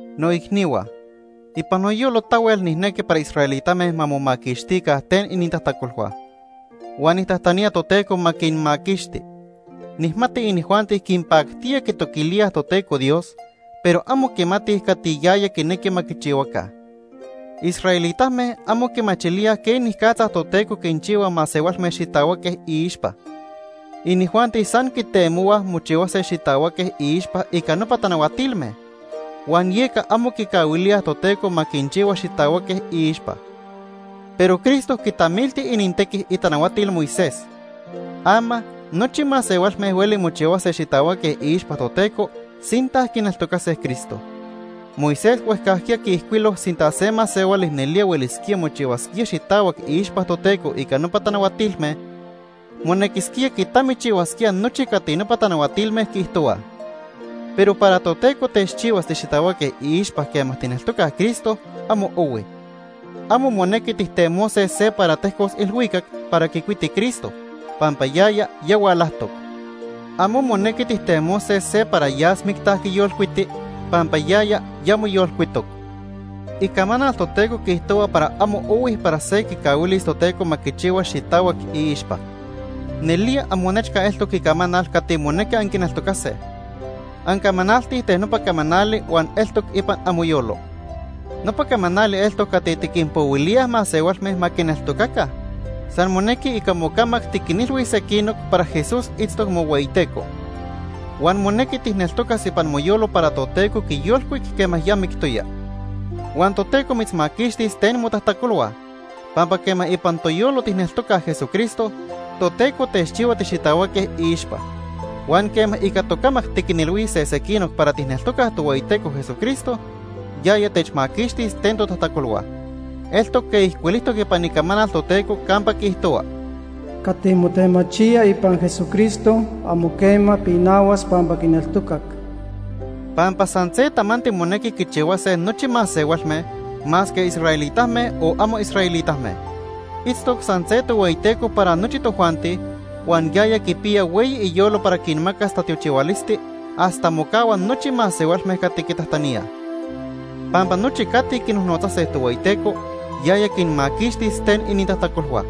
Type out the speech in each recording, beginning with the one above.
Noicnihua, ipan noyolo tahuel nijnequi para israelitame ma momaquixtica ten inintajtacolhua. Huan nijtajtanía Toteco ma quinmaquixti. Nijmati inijuanti quinpactía quitoquilíaj Toteco Dios, pero amo quimatij cati yaya quinequi ma quichihuaca. Israelitame amo quimachilíaj quenicatza Toteco quinchihua masehualme xitahuaque iixpa. Inijuanti san quitemohuaj mochihuase xitahuaque iixpa ica nopa tanahuatilme, huan yeca amo quicahuilíaj Toteco ma quinchihua xitahuaque iixpa. Pero Cristo quitamilti inintequi itanahuatil Moisés. Ama nochi masehualme hueli mochihuase xitahuaque iixpa Toteco sinta quineltocase Cristo. Moisés huejcajquiya quiijcuilo sinta se masehuali nelía huelisquía mochihuasquía xitahuac iixpa Toteco ica nopa tanahuatilme, monequisquía quitamichihuasquía nochi cati nopa tanahuatilme quiijtohuaj. Pero para Toteco techchihuas tixitahuaque iixpa quema tijneltocaj Cristo, amo ohui. Amo monequi tijtemose se para tejcos ilhuicac para quicuiti Cristo, pampa yaya ya hualajtoc. Amo monequi tijtemose se para yas micta quiyolcuiti pampa yaya ya moyolcuitoc. Icamanal Toteco quiijtohua para amo ohui para se quicahuilis Toteco ma quichihua xitahuac iixpa. Nelía amonechca eltoc icamanal cati monequi anquineltocase. Ancamanaltij ten nopa camanali huan eltoc ipan amoyolo. Nopa camanali eltoc cati tiquinpohuilíaj masehualme ma quineltocaca. San monequi ica mocamac tiquinilhuis sequinoc para Jesús itztoc mohueyiTeco. Huan monequi tijneltocas ipan moyolo para Toteco quiyolcuic quema ya mictoya. Huan Toteco mitzmaquixtis ten motajtacolhua. Pampa quema ipan toyolo tijneltocaj Jesucristo, Toteco techchihua tixitahuaque iixpa. Huan quema ica tocamac tiquinilhuise sequinoc para tijneltocaj Tohueyiteco Jesucristo, yaya techmaquixtis ten totajtacolhua. Eltoc quej ijcuilijtoc ipan Icamanal Toteco campa quiijtohua: “Cati motemachía ipan Jesucristo, amo quema pinahuas pampa quineltocac.” Pampa san se tamanti monequi quichihuase nochi masehualme masque israelitame, o amo israelitame. Itztoc san se Tohueyiteco para nochi tojuanti, huan yaya quipiya hueyi iyolo para quinmacas tatiochihualisti hasta mocahua nochi masehualme cati quitajtaníaj. Pampa nochi cati quinojnotzase Tohueyiteco, yaya quinmaquixtis ten inintajtacolhua.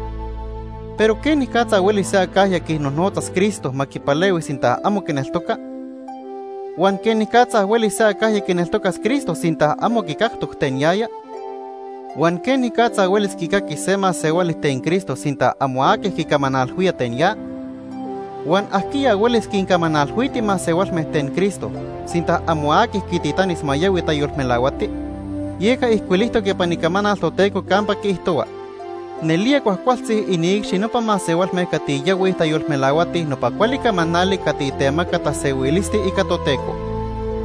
Pero ¿quenicatza huelis se acajya quinojnotzas Cristo ma quipalehui sinta amo quineltoca? Huan ¿quenicatza huelis se acajya quineltocas Cristo sinta amo quicactoc ten yaya? Huan ¿quenicatza huelis quicaquis se masehuali ten Cristo sinta amo aqui quicamanalhuía ten ya? Huan ¿ajquiya huelis quincamanalhuiti masehualme ten Cristo sinta amo aqui quititanis ma yahui tayolmelahuati? Yeca ijcuilijtoc ipan Icamanal Toteco campa quiijtohua: “Nelía cuajcualtzi iniicxi nopa masehualme cati yahuij tayolmelahuatij nopa cuali camanali cati temaca tasehuilisti ica Toteco.”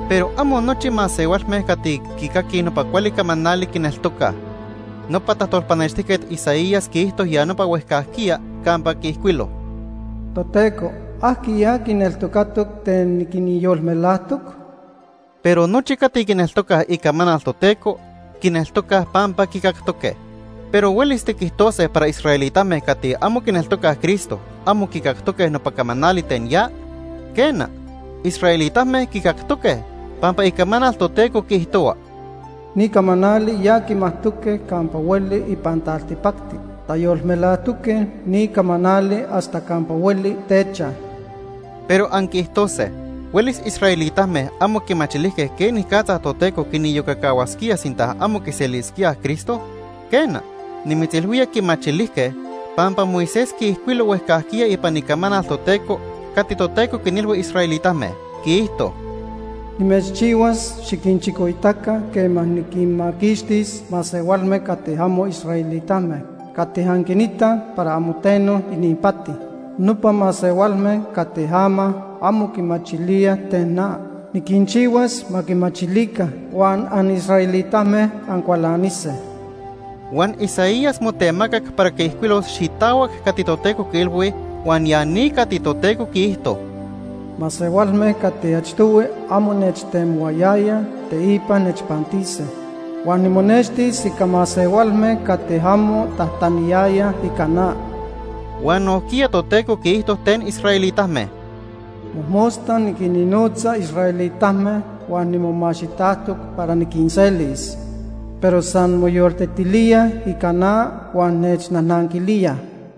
Pero amo nochi masehualme cati quicaquij nopa cuali camanali, quineltocaj. Nopa tajtolpanextijquet Isaías quiijto ya nopa huejcajquiya campa quiijcuilo: “Toteco, ¿ajquiya quineltocatoc ten niquinyolmelajtoc?” Pero nochi cati quineltocaj icamanal Toteco, quineltocaj pampa quicactoque. Pero ¿huelis tiquijtose para israelitame cati amo quineltocaj Cristo amo quicactoque nopa camanali ten ya? Quena, israelitame quicactoque, pampa Icamanal Toteco quiijtohua: “Ni camanali ya quimajtoque campa hueli ipan taltipacti. Tayolmelajtoque ni camanali hasta campa hueli techaj.” Pero anquiijtose: “¿Huelis israelitame amo quimachilijque quenicatza Toteco quiniyocacahuasquía sinta amo quiselisquíaj Cristo?” Quena, nimitzilhuía quimachilijque, pampa Moisés quiijcuilo huejcajquiya ipan Icamanal Toteco cati Toteco quinilhui israelitame, quiijto: “Nimechchihuas xiquinchicoitaca quema niquinmaquixtis masehualme cati amo israelitame cati anquinitaj para amo teno ininpati. Nopa masehualme cati ama amo quimachilíaj ten na, niquinchihuas ma quimachilica huan anisraelitame ancualanise.” Huan Isaías motemacac para quiijcuilos xitahuac cati Toteco quiilhui huan ya ni cati Toteco quiijto: “Masehualme cati achtohui amo nechtemohuayayaj, teipa nechpantise. Huan nimonextis ica masehualme cati amo tajtaniyayaj ica na.” Huan nojquiya Toteco quiijto ten israelitame: “Mojmosta niquinnotza israelitame huan nimomaxitajtoc para niquinselis, pero san moyoltetilíaj ica na huan nechnajnanquilíaj.”